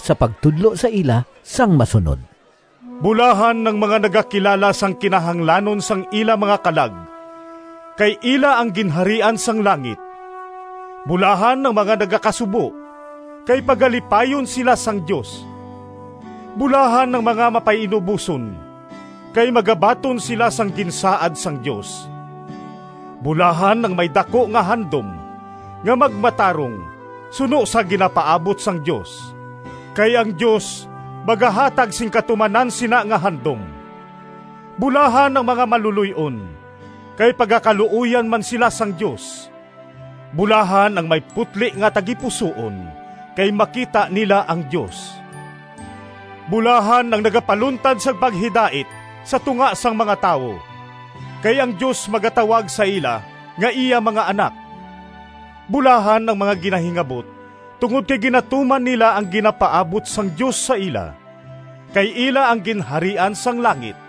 sa pagtudlo sa ila sang masunod: “Bulahan ang mga nagakilala Sang kinahanglanon sang ila mga kalag, Kay ila ang Ginharian sang langit! “Bulahan ang mga nagakasubo, Kay pagalipayon sila sang Dios! “Bulahan ang mga mapainuboson, Kay magabaton sila Sang ginsaad sang Dios! “Bulahan ang may daku nga handom Nga magmatarong Suno sa ginapaabot sang Dios, Kay ang Dios Magahatag sing katumanan Sina nga handom! “Bulahan ang mga maluloy-on, Kay pagakaluoyan man sila sang Dios! “Bulahan ang may putli nga tagipusoon, Kay makita nila ang Dios! “Bulahan ang nagapaluntad Sang paghidait Sa tunga sang mga tawo, Kay ang Dios magatawag sa ila Nga iya mga anak! “Bulahan ang mga ginahingabot Tungod kay ginatuman nila Ang ginapaabot sang Dios sa ila, Kay ila ang Ginharian sang langit!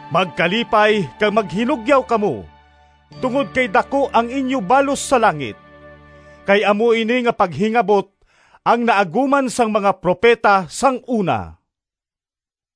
Magkalipay kag maghinugyaw kamo, tungod kay daku ang inyo balos sa langit. Kay amo ini nga paghingabot ang naaguman sang mga propeta sang una.”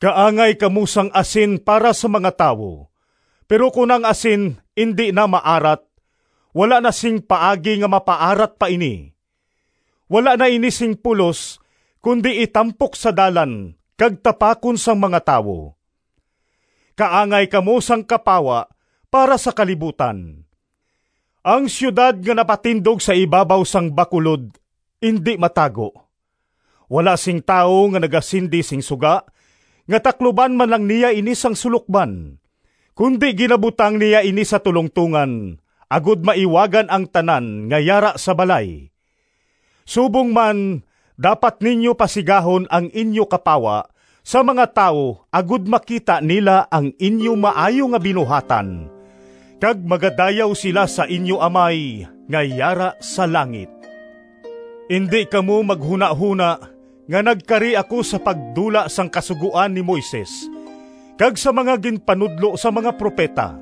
“Kaangay kamo sang asin para sa mga tawo. Pero kon ang asin indi na maarat, wala na sing paagi nga mapaarat pa ini. Wala na ini sing pulos kundi itampok sa dalan kag tapakon sang mga tawo. “Kaangay kamo sang kapawa para sa kalibutan. Ang siyudad nga napatindog sa ibabaw sang bakulod indi matago. Wala sing tawo nga nagasindi sing suga nga takluban man lang niya ini sang sulokban, kundi ginabutang niya ini sa tulongtongan agod maiwagan ang tanan nga yara sa balay. Subong man dapat ninyo pasigahon ang inyo kapawa sa mga tawo agod makita nila ang inyo maayo nga mga binuhatan, kag magadayaw sila sa inyo Amay nga yara sa langit.” “Indi kamo maghunahona nga nagkari ako sa pagdula sang Kasugoan ni Moises kag sang mga ginpanudlo sang mga propeta.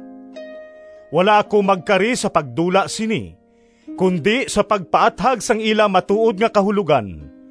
Wala ako magkari sa pagdula sini, kundi sa pagpaathag sang ila matuod nga kahulogan.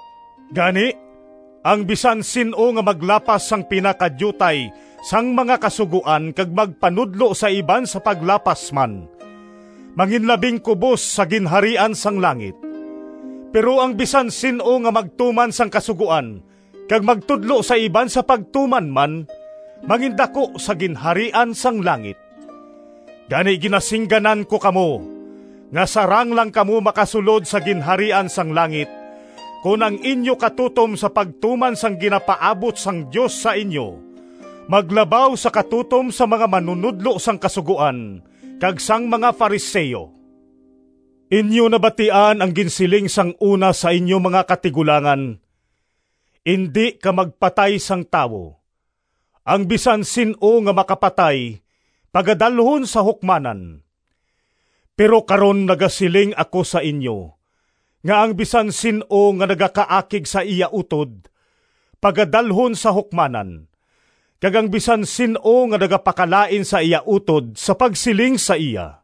Gani, ang bisan sin-o nga maglapas sang pinakadiutay sang mga Kasugoan kag magpanudlo sa iban sa paglapas man, manginlabing kubos sa Ginharian sang langit. Pero ang bisan sin-o nga magtuman sang Kasugoan kag magtudlo sa iban sa pagtuman man, mangindaku sa Ginharian sang langit. Gani ginasingganan ko kamo, nga sarang lang kamo makasulod sa Ginharian sang langit kon ang inyo katutom sa pagtuman sang ginapaabot sang Dios sa inyo maglabaw sa katutom sang mga manunodlo sang Kasugoan kag sang mga Fariseo.” “Inyo nabatian ang ginsiling sang una sa inyo mga katigulangan, ‘Indi ka magpatay sang tawo. Ang bisan sin-o nga makapatay pagadalhon sa hukmanan.’ Pero karon nagasiling ako sa inyo nga ang bisan sin-o nga nagakaakig sa iya utod, pagadalhon sa hukmanan; kag ang bisan sin-o nga nagapakalain sa iya utod, sa pagsiling sa iya,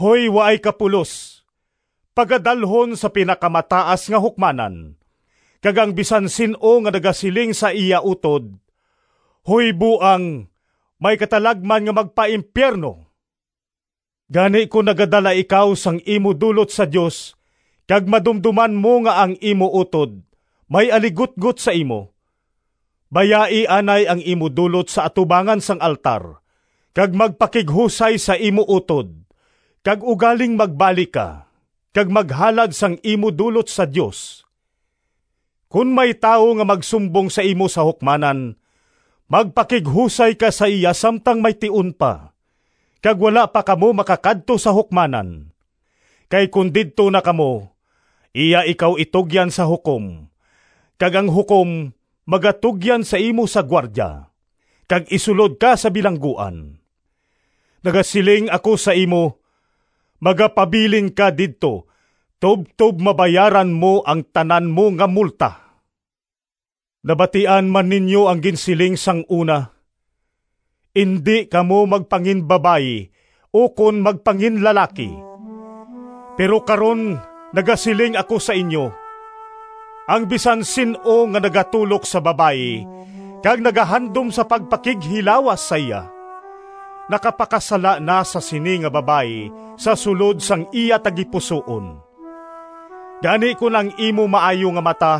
‘Hoy, waay ka pulos!’ pagadalhon sa Pinakamataas nga Hukmanan; kag ang bisan sin-o nga nagasiling sa iya utod, ‘Hoy, buang!’ may katalagman nga magpaimpiyerno. Gani kon nagadala ikaw sang imo dulot sa Dios kag madumdoman mo nga ang imo utod may aligutgot sa imo, bayai anay ang imo dulot sa atubangan sang altar kag magpakighusay sa imo utod, kag ugaling magbalik ka kag maghalad sang imo dulot sa Dios. “Kon may tawo nga magsumbong sa imo sa hukmanan, magpakighusay ka sa iya samtang may tion pa kag wala pa kamo makakadto sa hukmanan, kay kon didto na kamo, iya ikaw itugyan sa hukom kag ang hukom magatugyan sa imo sa gwardya, kag isulod ka sa bilangguan. Nagasiling ako sa imo, magapabilin ka didto tubtob mabayaran mo ang tanan mo nga multa.” “Nabatian man ninyo ang ginsiling sang una, ‘Indi kamo magpanginbabayi ukon magpanginlalaki.’ Pero karon nagasiling ako sa inyo: ang bisan sin-o nga nagatulok sa babayi kag nagahandom sa pagpakighilawas sa iya, nakapakasala na sa sini nga babayi sa sulod sang iya tagipusoon. Gani kon ang imo maayo nga mata,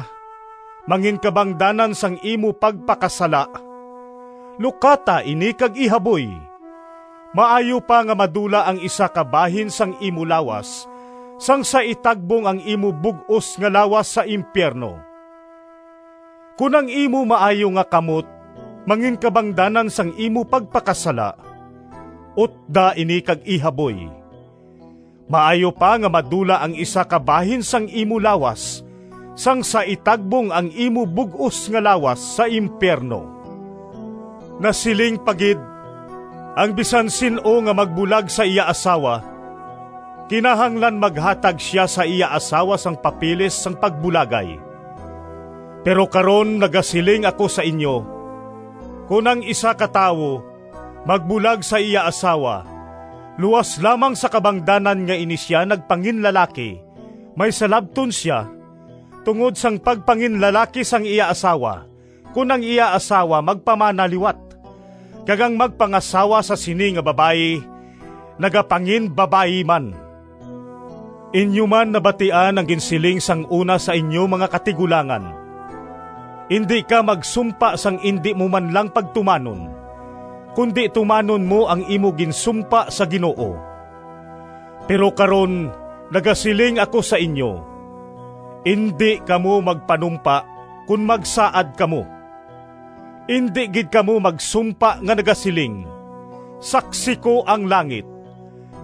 manginkabangdanan sang imo pagpakasala lukata ini kag ihaboy! Maayo pa nga madula ang isa ka bahin sang imo lawas sang sa itagbong ang imo bug-os nga lawas sa impiyerno. Kon ang imo maayo nga kamot manginkabangdanan sang imo pagpakasala, utda ini kag ihaboy! Maayo pa nga madula ang isa ka bahin sang imo lawas sang sa itagbong ang imo bug-os nga lawas sa impiyerno.” “Nasiling pa gid, ‘Ang bisan sin-o nga magbulag sa iya asawa, kinahanglan maghatag sia sa iya asawa sang papeles sang pagbulagay.’ Pero karon nagasiling ako sa inyo: kon ang isa ka tawo magbulag sa iya asawa luas lamang sa kabangdanan nga ini sia nagpanginlalaki, may salabton sia tungod sang pagpanginlalaki sang iya asawa kon ang iya asawa magpamana liwat, kag ang magpangasawa sa sini nga babayi nagapanginbabayi man.” “Inyo man nabatian ang ginsiling sang una sa inyo mga katigulangan, ‘Indi ka magsumpa sang indi mo man lang pagtumanon, kundi tumanon mo ang imo ginsumpa sa Ginoo.’ Pero karon nagasiling ako sa inyo: indi kamo magpanumpa kon magsaad kamo. Indi gid kamo magsumpa nga nagasiling, ‘Saksi ko ang langit,’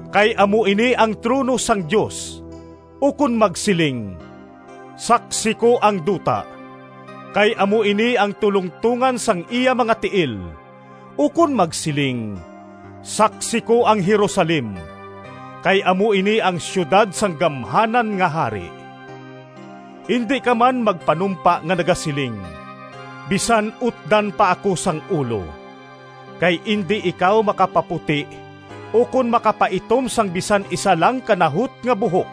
kay amo ini ang trono sang Dios; ukon magsiling, ‘Saksi ko ang duta,’ kay amo ini ang tulongtongan sang iya mga tiil; ukon magsiling, ‘Saksi ko ang Jerusalem,’ kay amo ini ang siyudad sang gamhanan nga Hari. Indi ka man magpanumpa nga nagasiling, ‘Bisan utdan pa ako sang ulo,’ kay indi ikaw makapaputi ukon makapaitom sang bisan isa lang ka nahot nga buhok.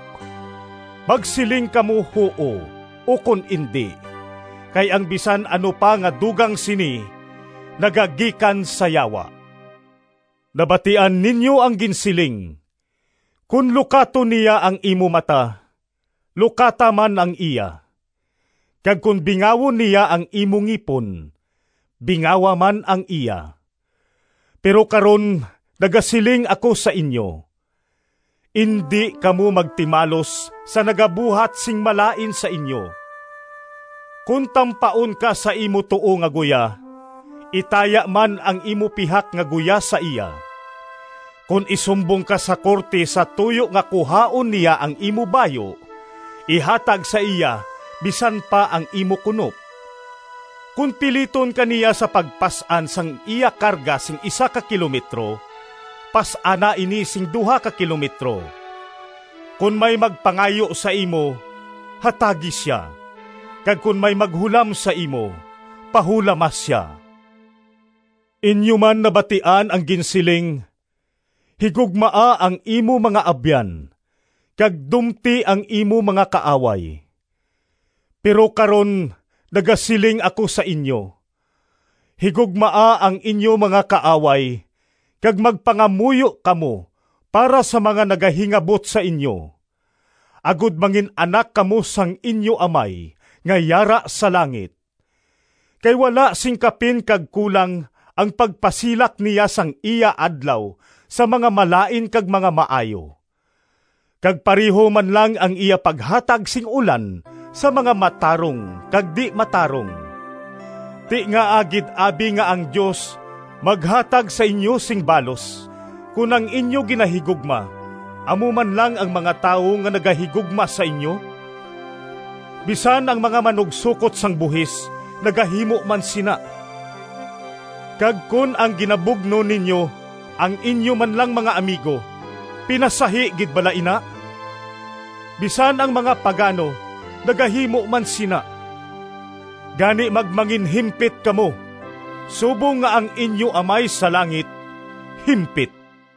Magsiling kamo ‘Huo’ ukon ‘Indi’ kay ang bisan ano pa nga dugang sini, nagagikan sa Yawa.” “Nabatian ninyo ang ginsiling, ‘Kon lukaton niya ang imo mata, lukata man ang iya, kag kon bingawon niya ang imo ngipon, bingawa man ang iya.’ Pero karon nagasiling ako sa inyo: indi kamo magtimalos sa nagabuhat sing malain sa inyo. Kon tampaon ka sa imo tuo nga guya, itaya man ang imo pihak nga guya sa iya. Kon isumbong ka sa korte sa tuyo nga kuhaon niya ang imo bayu, ihatag sa iya bisan pa ang imo kunop. Kon piliton ka niya sa pagpas-an sang iya karga sing isa ka kilometro, pas-ana ini sing duha ka kilometro. Kon may magpangayo sa imo, hatagi sia; kag kon may maghulam sa imo, pahulama sia.” “Inyo man nabatian ang ginsiling, ‘Higugmaa ang imo mga abyan, kag dumti ang imo mga kaaway.’ Pero karon nagasiling ako sa inyo: higugmaa ang inyo mga kaaway, kag magpangamuyo kamo para sa mga nagahingabot sa inyo, agod mangin-anak kamo sang inyo Amay nga yara sa langit. Kay wala sing kapin kag kulang ang pagpasilak niya sang iya adlaw sa mga malain kag mga maayo, kag pareho man lang ang iya paghatag sing ulan sa mga matarong kag di-matarong. Ti ngaa gid abi nga ang Dios maghatag sa inyo sing balos kon ang inyo ginahigugma amo man lang ang mga tawo nga nagahigugma sa inyo? Bisan ang mga manugsokot sang buhis nagahimo man sina! Kag kon ang ginabugno ninyo ang inyo man lang mga amigo, pinasahi gid bala ina? Bisan ang mga pagano nagahimo man sina! Gani, magmanginhimpit kamo, subong nga ang inyo Amay sa langit himpit.”